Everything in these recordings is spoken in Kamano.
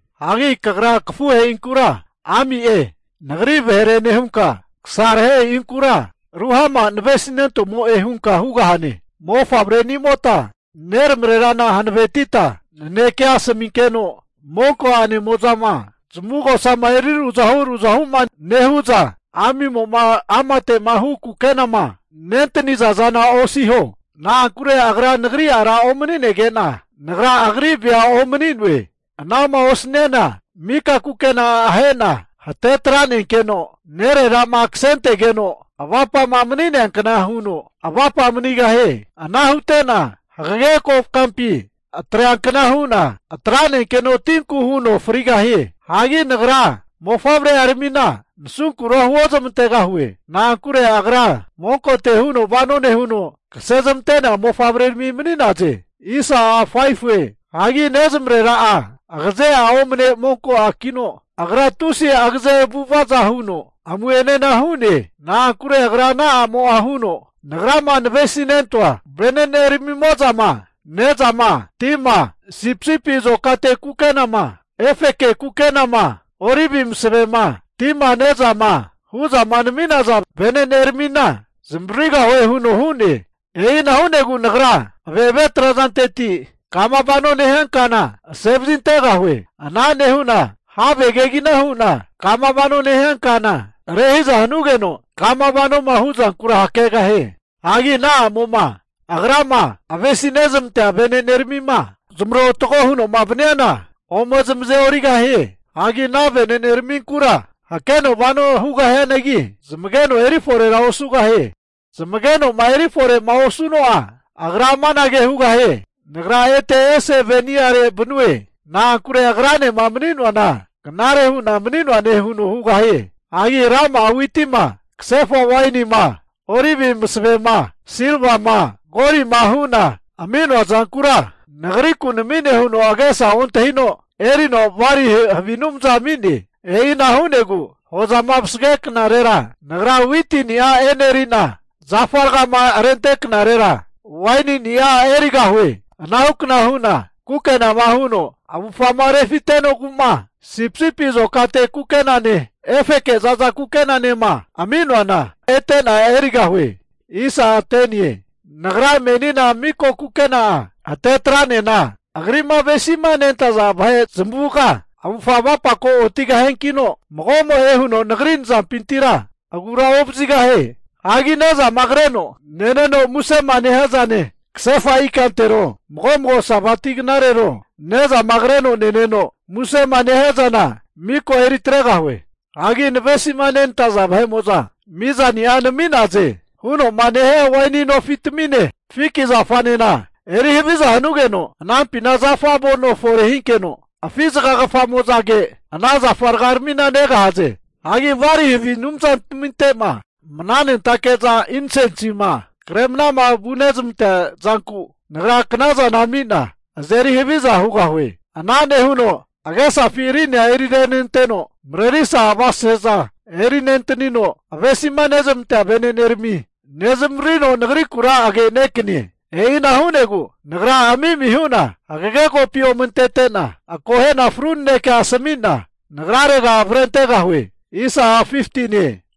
Hagi kagra kafuhe'inkura, Ami'e, Nagri vahere nehunka, kasarahehe'inkura Ruhama, navesinentomo'e, hunka hugahane. Mofavrenimota neramarerana hankavetita nanekea asaminkeno, monko ane'mo'zama zamavugosama eri ruzahu ruzahu'ma nehu'za, ami'mo'ma amate'ma hu kukenama nentaniza zana osino. Na'ankure agra nagri ara omanige'na, nagra agri vea omani'noe. Ana'ma osniana mika kukena'a ahena hate atranenkeno, nerera'ma kasentegeno kukena osu avapama mani'nea kna huno avapa manigahie. Ana hute'na hagage kokampi atreankna hu'na atranenkeno tinku huno frigahie. Hagi Nagra mofavre'aramina nasunkura huozmantegahue. Na'ankure agra monkote huno vano nehuno, kase zmante'nea mofavrerami mani'naze. Hagi nezmarera'a agaze'a omane monko a'kino, agra tusi agaze avu'avaza huno amu'enena hu'ne. Na'ankure agra ana a'mo'a huno, nagrama navesinentoa vene'neramimo'zama ne'zama, tima, sipisipi azokate kukenama, efeke kukenama, olivi masavema, wainima hu'za nami'naza vene'neramina zamavaririgahue huno hu'ne. E'ina hu'negu nagra ave'ave trazanteti kama vanoma nehia kana asevazintegahue. Ana nehu'na have kegina hu'na kama vano nehia kana rehiza hanugeno, kama vanoma hu'zankura hakegahie. Hagi ana a'mo'ma agrama avesi nezmantea vene'neramima zamarotago huno'ma vaniana ome zamaze'origahie. Hagi ana vene'neraminkura hakeno vano hugahianagi, zamageno eri forera osugahie. Zamageno'ma erifore'ma osnuno'a agra amanage hugahie, nagra ete ese ve'ni'are vanue. Na'ankure agranema mani'noana knare hu'na mani'noane huno hugahie. Hagi rama'a witima, kasefa wainima, olivi masavema, silvama golima hu'na ami'noa zankura nagriku nami'ne huno agesa ontahino, erino Bali havi anumza ami'ne. E'ina hu'negu hozama vasage knarera nagra witini'a eneri'na, zafa ragama rente knarera wainini'a erigahue. Ana hukna hu'na kukenama huno avufgama refite'nogu'ma sipisipi azokate kukenane efeke zaza kukenanema ami'noana ete'na erigahue. Nagra menina miko kukena'a hate atranena agri'ma avesima nentaza vahe zamavuga avufga avapako otigahiankino, mago'moe huno nagri nazampintira agura ovazigahie. Hagi ne'zama kreno neneno musema nehia zane, kasefa ikantero mago mago Sabati knarero, nezama kreno neneno musema nehia zana miko eri atregahue. Hagi navesima nenantaza vahe'mo'za mizani'a nami'naze huno'ma nehia waini nofitamine, fiki zafanena eri haviza hanugeno anampina zafa avono fore hinkeno afi zagagafamo'zage ana zafa ragaramina negahaze. Hagi Bali havi anumzantaminte'ma mnanentake'za insensima kremana vunezmantea zanku, Nagra knazana ami'na azeri haviza hugahue. Ana nehuno agesafi rinia eri renenteno, marerisa avasese'za eri nentanino avesima nezmantea vene'nerami nezmavaririno Nagrikura agenekanie. E'ina hu'negu Nagra ami'mi hu'na hagage kopi ome antete'na, akohena fru nanekea asami'na nagrarega avrentegahue.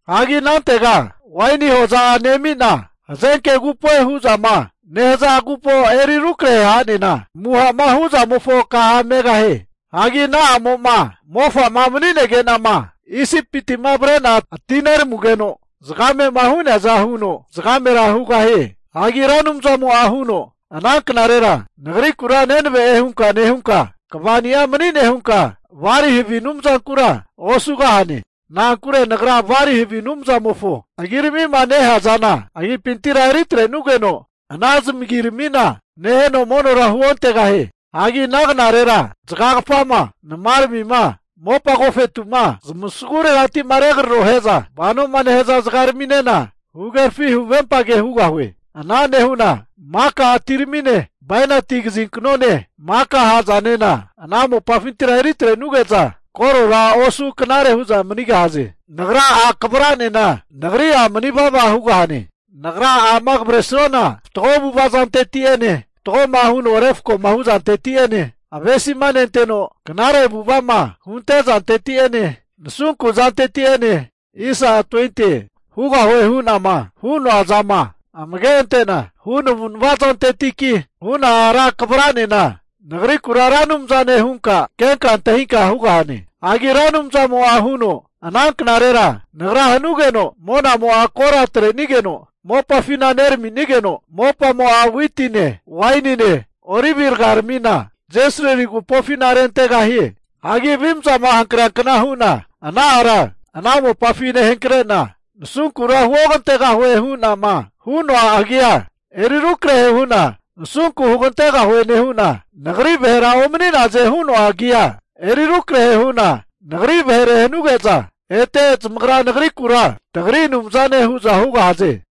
Hagi anantega waini hoza'a nemi'na, Hazenke Agupoe hu'zama nehaza agupo eri rukrahe ha'nena, amuha'ma hu'zamofo kaha megahie. Hagi ana a'mo'ma mofa'ma mani'nege'nama, Isipiti'ma avre'na ati'neramugeno zagamema hu'neaza huno zagamera hugahie. Hagi Ra Anumzamo'a huno, Ana knarera, Nagrikura nenave'e hunka nehunka, kvani'a mani'ne hunka Bali havi anumzankura osugahane. Na'ankure Nagra Bali havi anumzamofo agiramima nehea zana agipintira eri atrenugeno, ana zamagiramina neheno monora huontegahie. Hagi ana knarera zagagafama, namaramima, mopa agofetu'ma zamasaguregati'ma regrarohe'za vanoma nehaza zagaraminena, huhagerafi huvempage hugahue. Ana nehu'na maka atirami'ne, bainati kazinknone, maka ha'zanena ana mopafintira eri atre'nuge'za korora osu knare hu'za manigahaze. Nagra a' kavra'nena Nagri a' mani vava hugahane. Nagra a'ma kavresuana, fatgo avu'ava zanteti'ene fatgoma huno refkoma hu zanteti'ene avesima anteno knare avu'ava'ma hunte zanteti'ene nasunku zanteti'ene, hugahue hu'nama hu'noa zama amage ante'na hu navu'nava zantetiki huna ara kavra'nena, Nagrikura Ra Anumzane hunka kenka antahinka hugahane. Hagi Ra Anumzamo'a huno, Ana knarera Nagra hanugeno, monamo'a kora atrenigeno mopafina neranigeno, mopamo'a witine, wainine olivi rgaramina Jesrili agupofina rentegahie. Hagi avimzama hankreankna hu'na ana ara ana mopafi nehankre'na, nasunkura Huogantegahue hu'nama hu'noa agia eri rukrahe hu'na, Nasunku Hugantegahue nehu'na, Nagri vahera omani'naze hu'noa agia ete eri rukrahe hu'na, Nagri vahere hanuge'za, ete zamagra Nagrikura tagri Anumzane hu'za hugahaze.